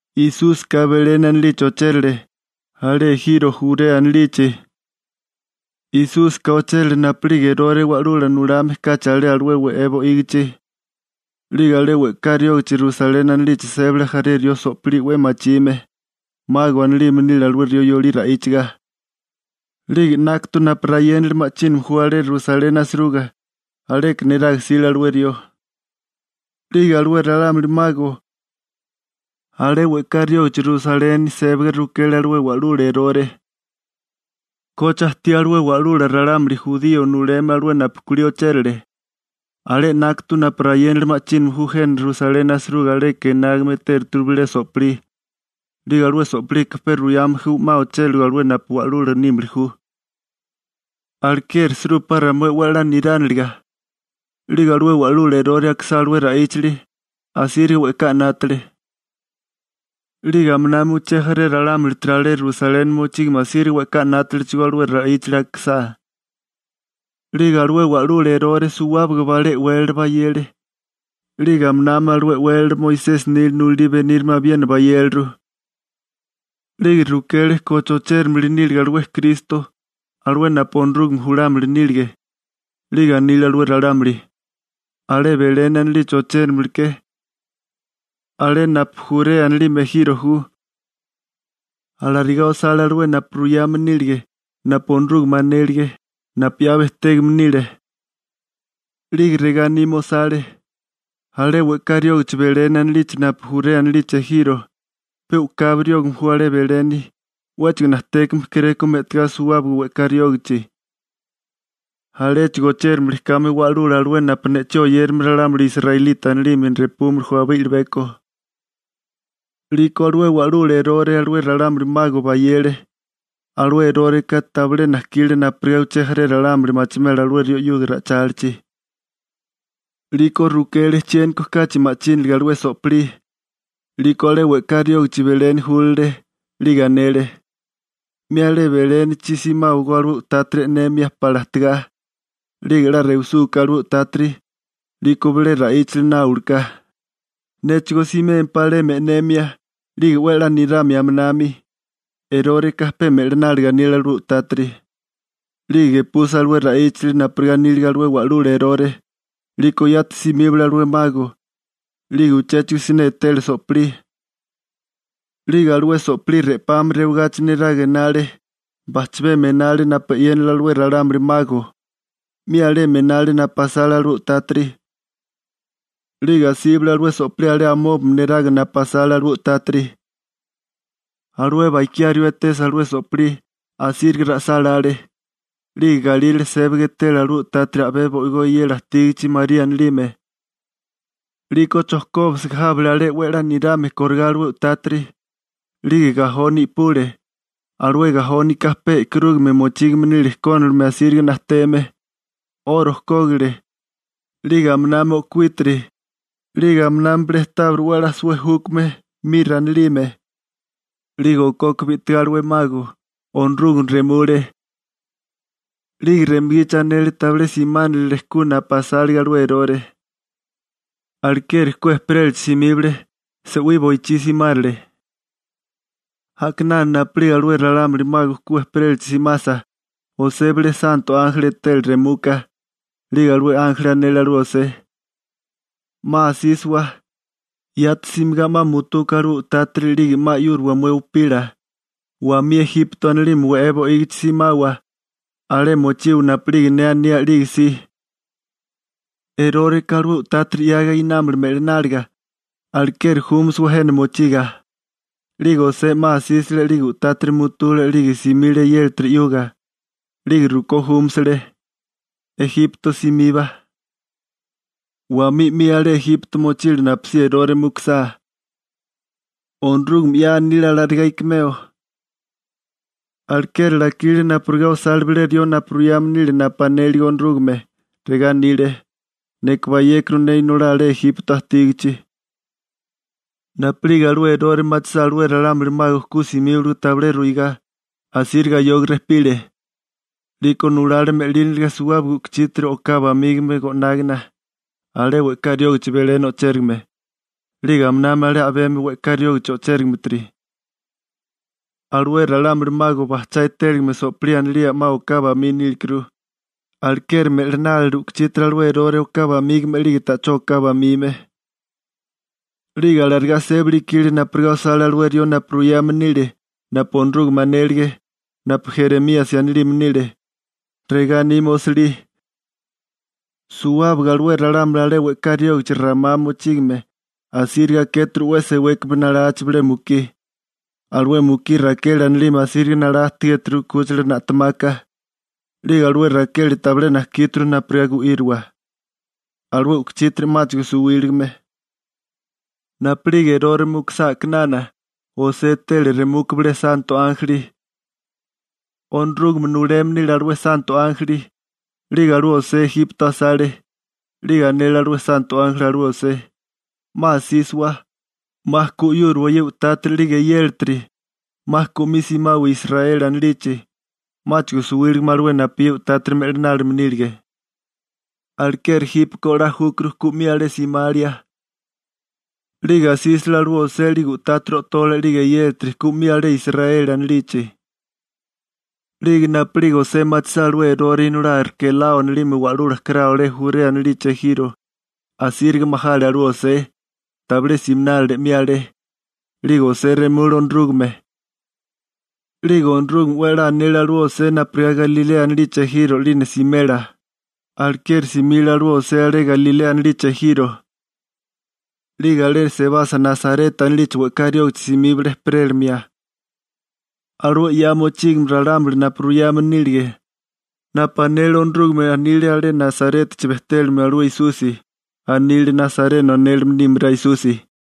Esúsika Beleni anilichi ochérale, alé ejiro Jurea anilichi. Esúsika ochérale napu'lige Erore wa'lula nulame kachi alé alué we'é bo'ígichi. 'Lige alé we'ká riógichi Rusaleni anilichi sébale jaré rió so'pilí 'we machime. «Mago» anilime nile alué rió yolí ra'íchaga. 'Lige 'nákatu napu rayénali ma'chíname ju alé Rusaleni asiruga, aleka neraga jsile alué rió. 'Lige alué ralámuli «mago» alé we'ká riógichi Rusaleni sébaga rukele alué wa'lula Erore: ―¿Koche ajtí alué wa'lula ralámuli jurío nuleme alué napu kulí ochérale? Alé 'nákatu napu rayénali ma'chíname ju jena Rusaleni asiruga aleka enágame etératuru bilé so'pilí, 'lige alué so'pilika pe ruyame ju 'ma ochériligo alué napu Wa'lula nímili ju. Alekeri jsirúpá ramué 'we a'lá nirániliga. 'Lige alué wa'lula Erore akisá alué ra'íchali, asíriga we'ká 'nátale. 'Lige aminá uché jaré ralámulitiri alé Rusaleni mochígame asíriga we'ká 'nátalechigó alué ra'íchali akisá. 'Lige alué wa'lula Erore suwábaga balé e'wélala bayele, 'lige aminami alué e'wélala Moisesi nila nulalí benírame abiena bayéleru. 'Lige rukele koche ochérimili níliga alué Kristo, alué napu Onorúgame julámili nílige. 'Lige anile alué ralámuli: ―Alé Beleni anilichi ochéramili ke, alé napu Jurea anilime ejiro ju. Alarigá osale alué napu ruyame nílige napu Onorúgame anélige, napu 'ya bejtégame nile. 'Lige regá anime osale: Alé we'ká riógichi Beleni anilichi napu ju Jurea anilichi ejiro, pe u'kabi riógame ju alé Beleni, 'wéchigo najtékame kéréko me'tagá suwábaga we'ká riógachi, aléchigo ochérimili kame Wa'lula, alué napu ne'chí oyérame ralámuli israelita anilime repúmili ju abé i'libeko. 'Liko alué wa'lula Erore alué ralámuli «mago» bayele. Alué Eróreka tabilé najkile napurigá uché jaré ralámuli machimela alué rió 'yuga ra'ichálichi. 'Liko rukele chiéniko kachi ma'chíniliga alué so'pilí. 'Liko alé we'ká riógichi Beleni júlale, 'lige anele: ―'Mi alé Belénichi simáwagó alué u'tátiri e'nemia pala ajtigá. 'Lige 'la rewisúká alué u'tátiri, 'liko yati juláwaká bilé rió ne'chí ruyéniliga, néchigó simémpá alemi e'nemia, 'lige 'we a'lá niramia aminami. (Eróreka pe me'lináliga anile alué u'tátiri.) 'Lige gepusa alué ra'íchali napurigá anílige alué wa'lula Erore, 'liko yati simíbale alué «mago». 'Lige uchéchigo siné etele so'pilí. 'Lige alué so'pilí re'pami rewigáchimi neraga enale, bajchabemi enale napu e'yénale alué ralámuli «mago», 'mi alemi enale napu asale alué u'tátiri. 'Lige asíbale alué so'pilí alé amóbami neraga napu asale alué u'tátiri. Alué bakiá rió etesa alué so'pilí, asíriga ra'sálále. 'Lige galírale sébaga etele alué u'tátiri a'bé bo'igó eyela ajtígichi María anilime. 'Liko chojkóbisiga jábale 'we a'lá nirame kórigá alué u'tátiri. 'Lige gajoni i'pule, alué gajónika pe e'karúgame mochígame nile kónilime asíriga najteme. 'Oro kógile, 'lige aminami o'kuítiri, 'lige aminami bilé tábiri 'we a'lá suwé júkame «mira» anilime. 'Lige okoka bi'tigá alué «mago», Onorúgame remule, 'lige remugichi anele tabilé simánilile ku napu asálige alué Erore. Alekeri ku ejperélachi simíbale, se'wí boichí simárale. A'kinana napu'lige alué ralámuli «mago» ku ejperélachi simasa, José bilé santo ánjeli etele remuka. 'Lige alué ánjeli anele alué José: ―'Ma asísawa, yati simigá 'ma mutuka alué u'tátiri 'lige 'ma 'yúriwa mué upila, wamí Ejipto anilime we'é bo'ígichi simawa. Alé mochiwa napu'lige ne aní a'lige si. Eróreka alué u'tátiri 'yaga einámala me'lináliga. Alekeri júmasawa jena mochiga. 'Lige José 'ma asísale 'lige u'tátiri mutule 'lige simile eyélatiri 'yuga, 'lige rukó júmasale, Ejipto simiba. Wamí 'mi alé Ejipto mochile napusí Erore mukusá. Onorúgame 'ya anile alarigá ikimeo. Alekeri lakile napurigá osale bilé rió napu ruyame nile napu anélige Onorúgame. Regá anile: «Neka bayékuru ne inolá alé Ejipto ajtígachi.» Napu'lige alué Erore machisá alué ralámuli «mago» ku simíbaligo tabilé ruigá, asíriga ayoga rejpile. 'Liko nulale me'líniliga suwábaga u'kuchítiri oká bamígame go'nágana, alé we'ká riógichi Beleni o'chérigame, 'lige aminami alé a'bemi we'ká riógichi o'chérigimetiri. Alué ralámuli «mago» bajchá etéligame so'pilí anilía 'ma oká bamí nílekuru, alekeri me'linálile u'kuchítiri alué Erore oká bamígame 'lige ta'chó oká bamime. 'Lige alarigá sébali ikile napurigá osale alué rió napu ruyame nile napu Onorúgame anélige napu Jeremíasi anilime nile, regá anime osilí: Suwábaga alué ralámuli alé we'ká riógichi Ramá mochígame asíriga akéturu 'we sewékame nalachi bilé mukí alué mukí Rakeli anilime asíriga nalá ajtigéturu 'kúchila na'temaka. 'Lige alué Rakeli tabilé najkíturu napurigá gu'íriwa, alué u'kuchítiri 'máchigo suwíligime. Napu'lige Erore mukusá a'kinana, José etele remuka bilé santo ánjeli. Onorúgame nuleme nile alué santo ánjeli. 'Lige alué José Ejipto asale. 'Lige anele alué santo ánjeli alué José: ―'Ma asísawa, 'ma ku 'yúriwa ye u'tátiri 'lige eyélatiri, 'ma ku 'mi simawa Israeli anilichi. 'Máchigo suwíligame alué napu ye u'tátiri me'linálime nílige. Alekeri jípeko 'la júkuru ku 'mi alé simalia. 'Lige asísale alué José 'lige u'tátiri o'tole 'lige eyélatiri ku 'mi alé Israeli anilichi. 'Lige napu'lige José machisá alué Erore inolá Arkelao anilime wa'lula karao alé Jurea anilichi ejiro, asíriga majale alué José, tabilé siminálile 'mi alé. 'Lige José remule Onorúgame. 'Lige Onorúgame 'we a'lá anele alué José napurigá Galilea anilichi ejiro 'lina simela, alekeri simile alué José alé Galilea anilichi ejiro. 'Lige alé sebasa Nasareta anilichi we'ká riógichi simíbale ejperélimia. Alué 'ya mochígame ralámuli napu ruyame nílige, napu anele Onorúgame anile alé Nasarétachi bejtélimio alué Esusi. Anile «nasareno» anélime nímará Esusi.